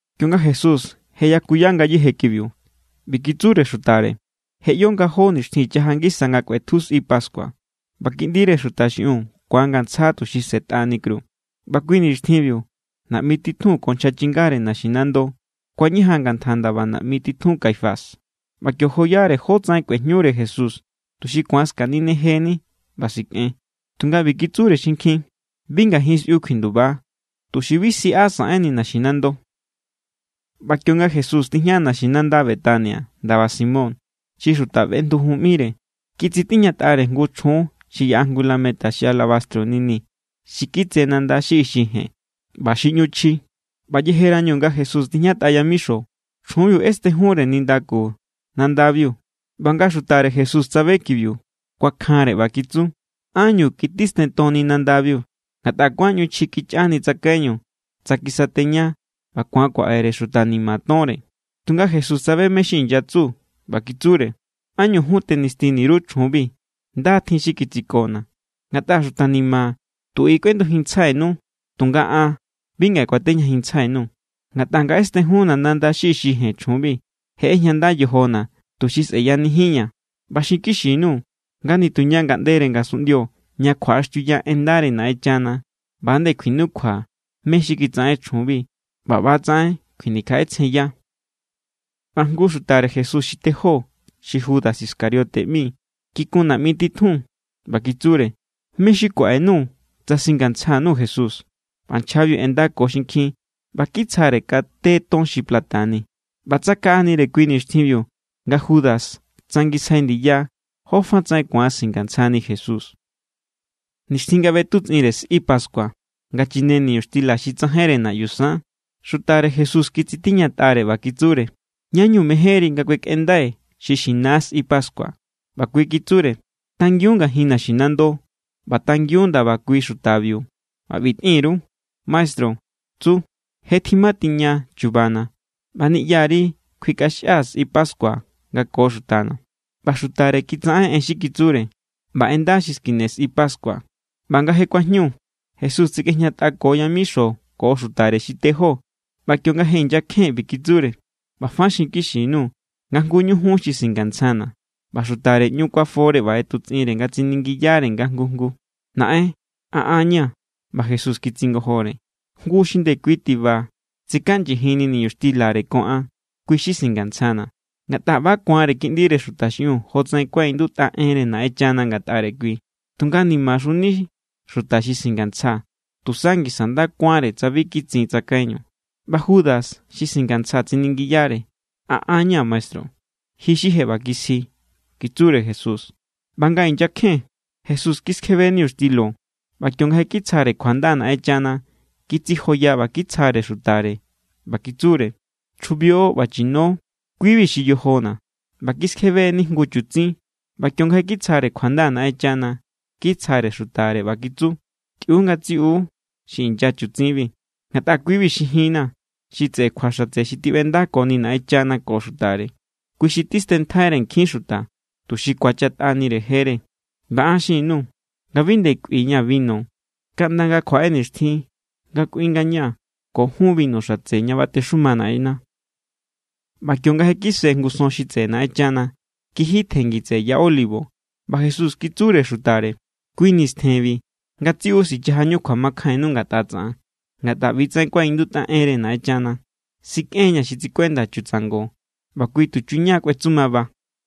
Kionga Jesús je yakuya ngayéje kibiu, ꞌbi kitsure xutare: —Je ꞌyo nga jó nixtjin chaja ngisa nga kꞌuetju sꞌi pascua, ꞌba Kiꞌndire Xuta xiꞌiun ku̱angantsja tuxi sꞌe̱tꞌani kru. ꞌBa kui nixtjinbiu naꞌmi titjun ko nchja chingare naxinando kuañajan ngantja ndaba naꞌmi titjun Caifás. ꞌBa kio joyare jótsaꞌen kꞌuejñure Jesús tuxi ku̱an skaninejeni ꞌba sikꞌen. Tunga ꞌbi kitsure xinkjin: —Bi ngajin sꞌiu kjuinduba, tuxi bi siꞌa saꞌenni naxinando. ꞌBa kionga Jesús tijña naxinanda Betania ndaba Simón xi xuta feꞌndujun ꞌmire, kitsitiñatꞌare jngu chjun xi yaꞌa jngu lameta xi alabastro nini xi kitse nanda xi ixi jen ꞌba xi ꞌñu chji. ꞌBa yejerañu nga Jesús tijñatꞌa yamixo, chjunbiu ꞌestejunre nindaku nandabiu. ꞌBa nga xutare Jesús tsabe kibiu, kuakjanre ꞌba kitsu: —¿Ánñu kitistentonni nandabiu? Ngatꞌa kuáan ꞌñu chji kichꞌani tsakaiñu tsa kisateña ꞌba ku̱an kuaꞌere xuta ni̱ma̱ tonre. Tunga Jesús tsabe mé= xi inyatsu, ꞌba kitsure: —¿Ánñu jun tenistini_ru chjunbi? Nda= tjin xi kitsikona̱. Ngatꞌa xuta ni̱ma̱ tu i= kꞌuendujinntsjainu, tunga an bi ngaꞌe kuatejñajinntsjai_nuu̱. Ngatꞌa nga ꞌestejunna̱ nanda xi ixi jen chjunbi, je ꞌejñanda yojona̱, tuxi sꞌe̱yanijinña̱. ꞌBa xinkixi_nuu̱ nga nituña ngaꞌndere ngasunꞌndio ña kjuaꞌaxtiuya en ndare Naꞌenchana, ꞌba=nde kjuinukjua mé= xi kitsaꞌen chjunbi ꞌba ꞌba=tsaꞌen kjuinikjaꞌetsjenya. ꞌBa jngu xutare Jesús xi tejó, xi Judas Iscariote ꞌmi, kikun naꞌmi titjun ꞌba kitsure: —¿Mé= xi kuaꞌenuu̱ tsa singantsja_nuu̱ Jesús? ꞌBa nchjabiu ꞌendako xinkjin ꞌba kitsjare kate ton xi plata ni. ꞌBa tsakaꞌanire kui nixtjinbiu nga Judas tsangisjai ndiya jófatsaꞌen ku̱an singantsjani Jesús. Nixtjin nga ꞌbetutsꞌinre sꞌi pascua, nga chine niñuxtila xi tsajainre naꞌyu san, xutare Jesús kitsitiñatꞌare ꞌba kitsure: —¿Ñá=ñu mejénri nga kuekꞌendai xi xina sꞌi pascua? ꞌBa kui kitsure: —Tangiun ngajin naxinando ꞌba tangiun ndaba kui xutabiu ꞌba ꞌbi tꞌin_ru: “Maestru tsu: Je tjimatiña chubana̱, ꞌba niꞌyari kjuikꞌaxjia̱ sꞌi pascua nga ko xutana̱.” ꞌBa xutare kitsaꞌen xi kitsure, ꞌba ꞌenda xi skine sꞌi pascua. ꞌBa nga je kuajñu, Jesús tsikꞌejñatꞌako yamixo ko xutare xi tejó. ꞌBa kionga je inyakjen, ꞌbi kitsure: —ꞌBa fa xinkixi_nuu̱ nga jnguñu jun xi singantsjana̱. ꞌBa xutare ꞌñu kuafore ꞌba ꞌetutsꞌinre nga tsiningiyare nga jngu jngu: —Naꞌen, ¿a an ña̱? ꞌBa Jesús kitsingojore: —Jngu xi ndekui tiba tsikaꞌnyijinni niñuxtilare ko an, kui= xi singantsjana̱. Ngatꞌa ꞌba= ku̱anre Kiꞌndire Xuta xiꞌiun jotsaꞌen kuaꞌindutꞌa enre Naꞌenchana ngatꞌare kui. Tunga, ¡nimaxuni xuta xi singantsja! Tusa ngisa nda kuánre tsa bi kitsin tsakaiñu. ꞌBa Judas xi singantsja, tsiningiyare: —¿A an= ña̱, maestru? —Ji xi je ꞌba kisji —kitsure Jesús. ꞌBa nga inyakjen, Jesús kiskjebe niñuxtilo ꞌba kionga je kitsjare kjuanda Naꞌenchana, kitsijoya ꞌba kitsjare xutare, ꞌba kitsure: —Chjubio ꞌba chino, kui=bi xi yojona̱. ꞌBa kiskjebe=ni jngu chutsin ꞌba kionga je kitsjare kjuanda Naꞌenchana, kitsjare xutare, ꞌba kitsu: —Tꞌiu ngatsiꞌiu xi inya chutsinbi. Ngatꞌa kui=bi xi jinna̱, xi tseꞌe kjua xatse xi tiꞌbendakoni Naꞌenchana ko xutare. Kui xi tistenntjaire nkjin xuta, tuxi ku̱achatꞌanire jere. ꞌBa an xin_nuu̱ nga bi nde kꞌuiña̱ binu, kaꞌnda nga kjuaꞌe nixtjin nga kꞌui ngañaa̱ ko jun binu xatse ña batexuma Naꞌenna̱. ꞌBa kionga je kise jngu son xi tseꞌe Naꞌenchana, kiji tjengi tseꞌe ya Olivo. ꞌBa Jesús kitsure xutare: —Kui nistjenbi ngatsiꞌu sichajañu kjuamakjainnu ngatꞌa tsaꞌan. Ngatꞌa ꞌbi=tsaꞌen kuaꞌindutꞌa enre Naꞌenchana: “Sikꞌen=ña̱ xi tsikuenda chutsango, ꞌba kui tuchuña= kꞌuetsumaba.”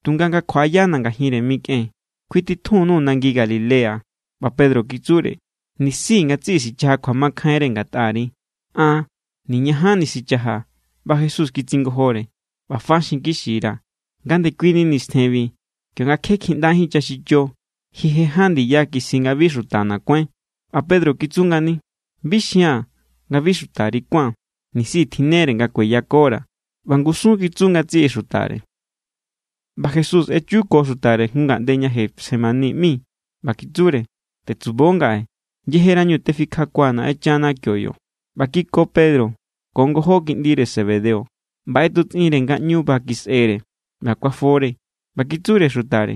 Tunga nga kjuaꞌayana̱ ngajinre mikꞌen, kjuititjun_nuu̱ nangi Galilea. ꞌBa Pedro kitsure: —Nisi ngatsiꞌi sichaja kjuamakjainre ngatꞌari, an niñajanni sichajaa̱. ꞌBa Jesús kitsingojore: —ꞌBa fa xinkixira̱ nga ndekuini nistjenbi, kionga kje kjiꞌndajín chaxicho, ji je ján ndiya kisji nga bi xutana̱ kuáin. ꞌBa Pedro kitsu ngani: —Bi xia̱n nga bi xutari kuán, nisi tjinnere nga kueyakora̱. ꞌBa ngusun kitsu ngatsiꞌi xutare. ꞌBa Jesús echu ko xutare jngu ngaꞌnde ña Getsemaní ꞌmi, ꞌba kitsure: —Tetsubo ngaꞌe yejerañu tefikjakuaa̱ Naꞌenchana kio yo. ꞌBa kiko Pedro ko ngojó kiꞌndire Zebedeo, ꞌba ꞌetutsꞌinre nga ꞌñu ba kisꞌere ꞌba kuafore. ꞌBa kitsure xutare: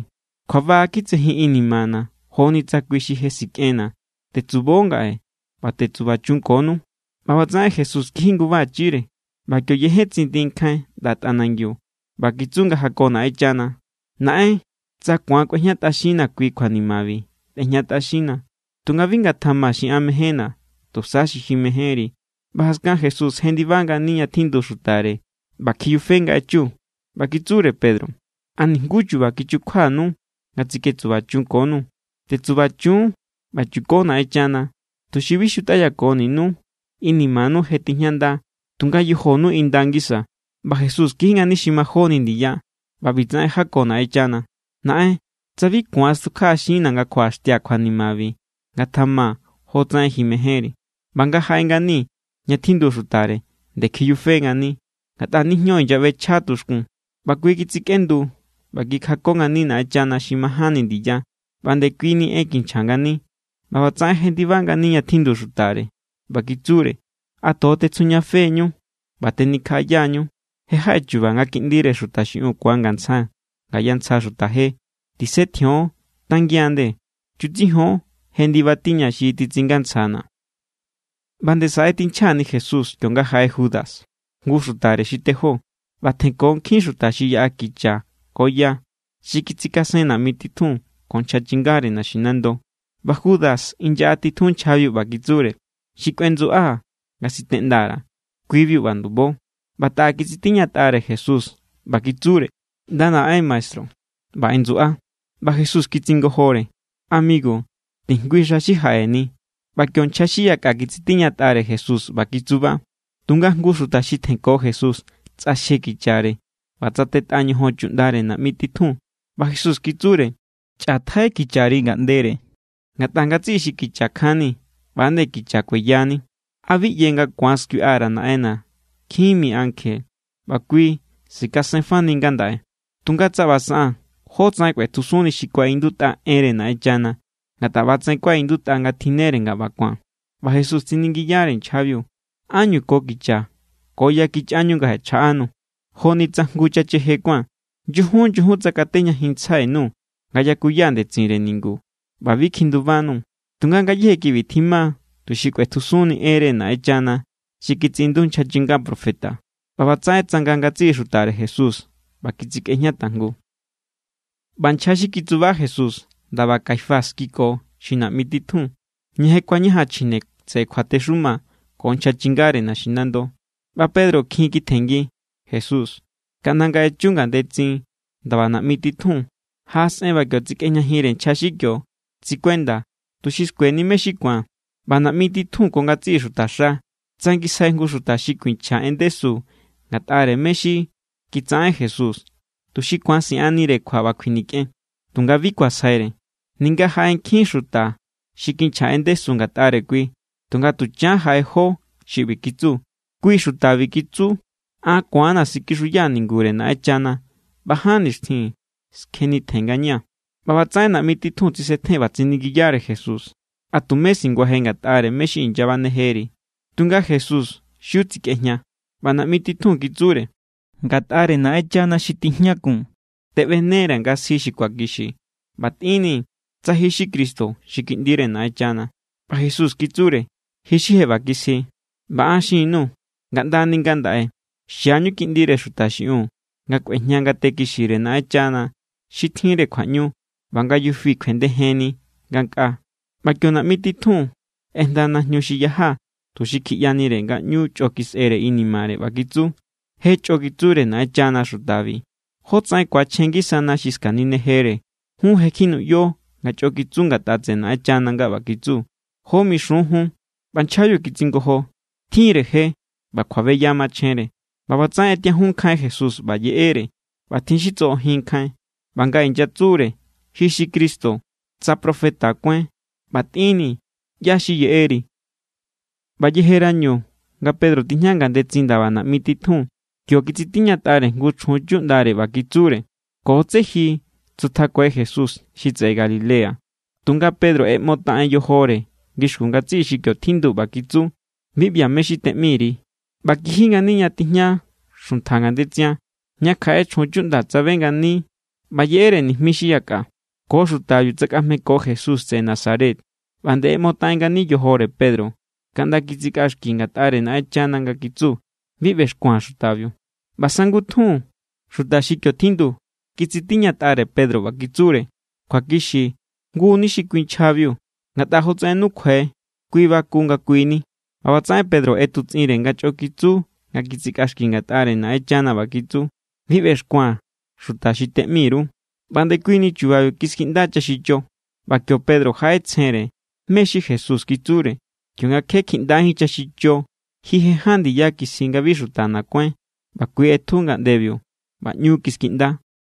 —Kjuaba kitsejin inimana̱ joni tsa kui xi je sikꞌenna̱. Tetsubo ngaꞌe ꞌba tetsubachunkonu. ꞌBa ꞌbatsaꞌen Jesús kiji ngubachire ꞌba kio yejen tsindi nkjain ꞌnda tꞌanangiu, ꞌba kitsu nga jako Naꞌenchana: —Naꞌen, tsa ku̱an kꞌuejñatꞌaxinnaa̱ kui kjuanimabi, tꞌejñatꞌaxinnaa̱. Tunga bi ngatjama xi an mejénna̱, tusa xi ji mejénri. ꞌBa jaskan Jesús jendiba ngani ña tjindu xutare, ꞌba kjiyufe nga echu. ꞌBa kitsure Pedro: —¿A nijnguú chu̱ba̱ kichukjuanu nga tsiketsubachunkonu? Tetsubachun ꞌba chuko Naꞌenchana, tuxi bi xutꞌayakoninú. Inimanu je tijñanda, tunga yojonu inda ngisa. ꞌBa Jesús kiji ngani xi majóni ndiya, ꞌba ꞌbitsaꞌen jako Naꞌenchana: —Naꞌen, tsa bi ku̱an stukjaꞌaxinna̱ nga kjuaꞌaxtia̱ kjuanimabi, ngatjama jotsaꞌen ji mejénri. ꞌBa nga jaꞌe ngani ña tjindu xutare, nde kiyufe=ngani, ngatꞌa nijño inyaꞌbechja tuxkun. ꞌBa kui kitsikꞌendu ꞌba kikjako ngani Naꞌenchana xi majánni ndiya, ꞌba ndekuini en kinchja ngani. ꞌBa ꞌbatsaꞌen jendiba ngani ña tjindu xutare, ꞌba kitsure: —¿A tojo tetsjujñafe=ñu ꞌba tenikjaꞌaya=ñu? Je jaꞌe chu̱ba̱ nga Kiꞌndire Xuta xiꞌiun ku̱angantsja ngaya ntsja xuta je. Tisetjion, tangian nde. Chutsijon, je ndiba tiña xi titsingantsjana̱. ꞌBa nde saꞌe= tinchja=ni Jesús kionga jaꞌe Judas, jngu xutare xi tejó. ꞌBa tjenko nkjin xuta xi yaꞌa kicha ko ya. Xi kitsikasen naꞌmi titjun ko nchja chingare naxinando. ꞌBa Judas inyaꞌatitjun nchjabiu ꞌba kitsure: —Xi kꞌuendsuꞌaa̱ nga siteꞌnda_ra̱, kui=biu ꞌba ndubo. ꞌBa taꞌa kitsitiñatꞌare Jesús ꞌba kitsure: —ꞌNda naꞌen, maestru. ꞌBa ꞌendsuꞌa. ꞌBa Jesús kitsingojore: —Amigu, tijngui xa xi jaꞌeni. ꞌBa kio nchja xi yakꞌa kitsitiñatꞌare Jesús ꞌba kitsuba. Tunga jngu xuta xi tjenko Jesús tsꞌaxje kichare, ꞌba tsatetꞌa ñojon chuꞌndare naꞌmi titjun. ꞌBa Jesús kitsure: —Chꞌatjai kichari ngaꞌndere. Ngatꞌa ngatsiꞌi xi kicha kjanni, ꞌba=nde kicha kueyani. ¿A bi ꞌye nga ku̱an skuiꞌa_ra̱ Naꞌenna̱ nkjin mi ankje, ꞌba kui sikasenfani ngandaꞌe? Tunga tsa ꞌba saꞌaa̱n, ¿jótsaꞌen kꞌuetjusunni xi kuaꞌindutꞌa enre Naꞌenchana? Ngatꞌa ꞌba=tsaꞌen kuaꞌindutꞌa nga tjinnere nga ꞌba ku̱an. ꞌBa Jesús tsiningiyare nchjabiu: —¿Ánñu ko kicha ko ya kichꞌañu nga jaꞌechjaꞌanuu̱, joni tsa jngu chacheje kuán? Nyujun, nyujun tsakatejñajinntsjai_nuu̱ nga yakuya ndetsinre ningu, ꞌba bi kjindubanuu̱. Tunga ngayéje kibi tjima, tuxi kꞌuetjusunni enre Naꞌenchana xi kitsiꞌindu nchja chinga profeta. ꞌBa ꞌbatsaꞌen tsanga ngatsiꞌi xutare Jesús ꞌba kitsikꞌejña tajngu. ꞌBa nchja xi kitsuba Jesús ndaba Caifás kiko xi naꞌmi titjun. Ña je kuañajan chjine tseꞌe kjuatexuma ko nchja chingare naxinando. ꞌBa Pedro kjin kitjenngi Jesús kaꞌnda nga echu ngandetsin ndaba naꞌmi titjun. Jaꞌasꞌen ꞌba kio tsikꞌejñajinre nchja xi kio tsikuenda, tuxi skueni mé= xi ku̱an. ꞌBa naꞌmi titjun ko ngatsiꞌi xutaxa tsangisjai jngu xuta xi kuinchja en ndesu ngatꞌare mé= xi kitsaꞌen Jesús, tuxi ku̱an siꞌannire kjua ꞌba kjuinikꞌen. Tunga bi kuasjaire, ninga jaꞌe nkjin xuta xi kinchja en ndesu ngatꞌare kui. Tunga tuchan jaꞌe jó xi ꞌbi kitsu: —Kui xutabi kitsu: “An ku̱an=na̱ sikixuyaa̱ ningure Naꞌenchana ꞌba ján nixtjin skjenitjen ngañaa̱.” ꞌBa ꞌbatsaꞌen naꞌmi titjun tsisetjen ꞌba tsiningiyare Jesús: —¿A tumé singuaje ngatꞌare mé= xi inyabanejeri? Tunga Jesús xiu tsikꞌejña. ꞌBa naꞌmi titjun kitsure: —Ngatꞌare Naꞌenchana xi tijñakun teꞌbenera̱ nga sji xi kjuakixi. ꞌBa tꞌinnii̱ tsa ji xi Cristo xi Kiꞌndire Naꞌenchana. ꞌBa Jesús kitsure: —Ji xi je ꞌba kisji. ꞌBa an xin_nuu̱ nga ꞌndani ngandaꞌe xiañu Kiꞌndire Xuta xiꞌiun nga kꞌuejña ngate kixire Naꞌenchana xi tjinre kjuaꞌñu ꞌba nga yufi kjuendejinni ngankꞌaa. ꞌBa kio naꞌmi titjun ꞌejnda najñu xi yaja tuxi kjiꞌyanire nga ꞌñu chꞌo kisꞌere inimare, ꞌba kitsu: —¡Je chꞌo kitsure Naꞌenchana xutabi! ¿Jótsaꞌen ku̱achjen ngisana xi skaninejere? Jun je kjinuꞌyo nga chꞌo kitsu ngatꞌa tseꞌe Naꞌenchana nga ꞌba kitsu. ¿Jó mixun jun? ꞌBa nchjabiu kitsingojo: —Tjin=re je ꞌba kjuabeya machjenre. ꞌBa ꞌbatsaꞌen ꞌetiajun nkjain Jesús ꞌba yeꞌere, ꞌba tjin xi tsoꞌojin nkjain. ꞌBa nga inyatsure: —Ji xi Cristo, tsa profeta kuáin, ꞌba tꞌinni̱ ꞌyá= xi yeꞌeri. ꞌBa yejerañu nga Pedro tijña ngandetsin ndaba naꞌmi titjun, kio kitsitiñatꞌare jngu chjun chuꞌndare ꞌba kitsure: —Ko tsé ji tsutjakuai Jesús xi tseꞌe Galilea. Tunga Pedro ꞌeꞌmotaꞌen yojore ngixkun ngatsiꞌi xi kio tjindu ꞌba kitsu: —Bi ꞌbia̱ mé= xi teꞌmi_ri. ꞌBa kiji ngani ña tijña xuntja ngandetsian, ña kjaꞌe chjun chuꞌnda tsabe ngani ꞌba yeꞌere nijmi xi yakꞌa: —Ko xutabiu tsakꞌajmeko Jesús tseꞌe Nazaret. ꞌBa nde ꞌeꞌmotaꞌen ngani yojore Pedro, kaꞌnda kitsikꞌaxki= ngatꞌare Naꞌenchana nga kitsu: —¡Bi ꞌbexkua̱n xutabiu! ꞌBa sangutjun, xuta xi kio tjindu kitsitiñatꞌare Pedro ꞌba kitsure: —Kjuakixi jngu=ni xi kui nchjabiu. Ngatꞌa jotsaꞌen nukjuai kui baku nga kui= ni. ꞌBa ꞌbatsaꞌen Pedro ꞌetutsꞌinre nga chꞌo kitsu nga kitsikꞌaxki ngatꞌare Naꞌenchana ꞌba kitsu: —¡Bi ꞌbexkua̱n xuta xi teꞌmi_ru! ꞌBa ndekuini chubabiu kiskiꞌnda chaxicho. ꞌBa kio Pedro jaꞌetsjenre mé= xi Jesús kitsure: “Kionga kje kjiꞌndajín chaxicho, ji je ján ndiya kisji nga bi xutana̱ kuáin.” ꞌBa kui ꞌetju ngaꞌndebiu, ꞌba ꞌñu kiskiꞌnda.